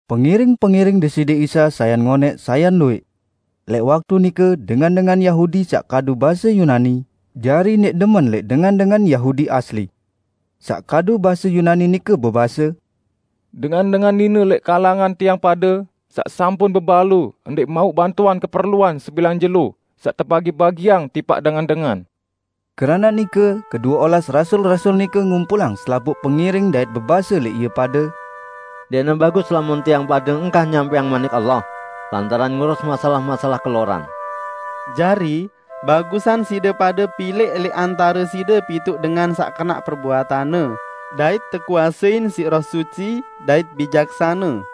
Pengiring-pengiring Deside Isa sayan ngonẽq sayan luwẽq. Lẽq waktu nike dengan-dengan Yahudi saq kadu base Yunani, jari ndẽq demen lẽq dengan-dengan Yahudi asli. Saq kadu base Yunani nike bebase, "Dengan-dengan nine lẽq kalangan tiang pade saq sampun bebalu ndẽq mauq bantuan keperluan sebilang jelo saq tebagi-bagiang tipaq dengan-dengan." Keranaq nike, kedue olas rasul-rasul nike ngumpulang selapuq pengiring dait bebase lẽq ie pade, "Ndẽqne bagus lamun tiang pade engkah nyampẽang Manik Allah, lantaran ngurus masalah-masalah keloran. Jari, bagusan side pade pilẽq lẽq antare side pituq dengan saq kenaq perbuatanne dait tekuasein siq Roh Suci dait bijaksane,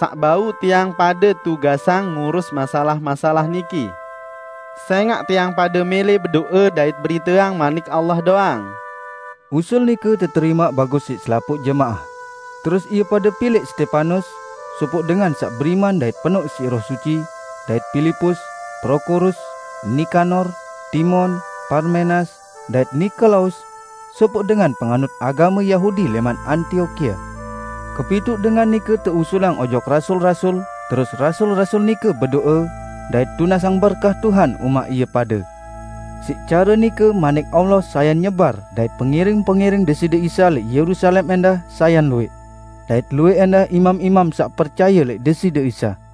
saq bau tiang pade tugasang ngurus masalah-masalah niki; sẽngaq tiang pade mẽlẽ bedo'e dait beriteang Manik Allah doang." Usul nike teterimaq bagus siq selapuq jemaah, terus ie pade pilẽq Stepanus, sopoq dengan saq beriman dait penoq siq Roh Suci, dait Pilipus, Prokorus, Nikanor, Timon, Parmenas, dait Nikolaus, sopoq dengan penganut agame Yahudi lẽman Antiokia. Kepituq dengan nike teusulang ojok rasul-rasul, terus rasul-rasul nike bedo'e dait tunasang berkah Tuhan umaq ie pade. Siq care nike Manik Allah sayan nyebar dait pengiring-pengiring Deside Isa lẽq Yerusalem ẽndah sayan luwẽq. Dait luwẽq ẽndah imam-imam saq percaye lẽq Deside Isa.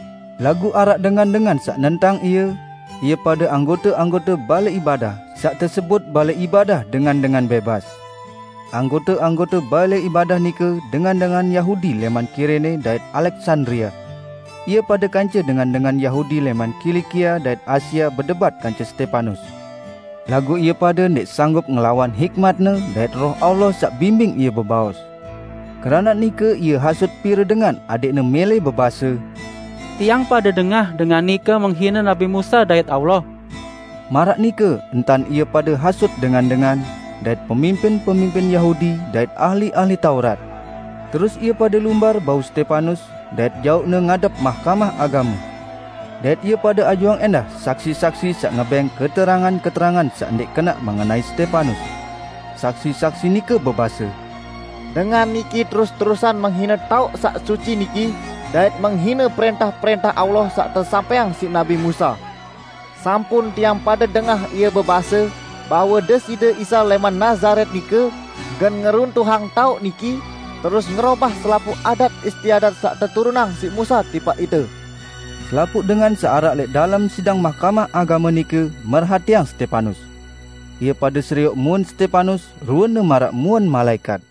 Laguq araq dengan-dengan saq nentang ie; ie pade anggote-anggote balẽ ibadah saq tesebut Balẽ Ibadah Dengan-dengan Bẽbas. Anggote-anggote balẽ ibadah nike dengan-dengan Yahudi lẽman Kirene dait Aleksandria. Ie pade kance dengan-dengan Yahudi lẽman Kilikia dait Asia bedebat kance Stepanus. Laguq ie pade ndẽq sanggup ngelawan hikmatne dait Roh Allah saq bimbing ie bebaos. Keranaq nike ie hasut pire dengan adẽqne mẽlẽ bebase, "Tiang pade dengah dengan nike menghine nabi Musa dait Allah!" Maraq nike entan ie pade hasut dengan-dengan, dait pemimpin-pemimpin Yahudi dait ahli-ahli Taurat. Terus ie pade lumbar bau Stepanus, dait jauqne ngadep Mahkamah Agame. Dait ie pade ajuang ẽndah saksi-saksi saq ngebẽng keterangan-keterangan saq ndẽq kenaq mengenai Stepanus. Saksi-saksi nike bebase, "Dengan niki terus-terusan menghine taoq saq suci niki dait menghine prẽntah-prẽntah Allah saq tesampẽang siq nabi Musa. Sampun tiang pade dengah ie bebase, bahwe Deside Isa lẽman Nazaret nike gen ngeruntuhang taoq niki, terus ngerobah selapuq adat-istiadat saq teturunang siq Musa tipaq ite!" Selapuq dengan saq araq lẽq dalem sidang Mahkamah Agame nike merhatiang Stepanus. Ie pade serioq muen Stepanus ruene maraq muen malaẽkat.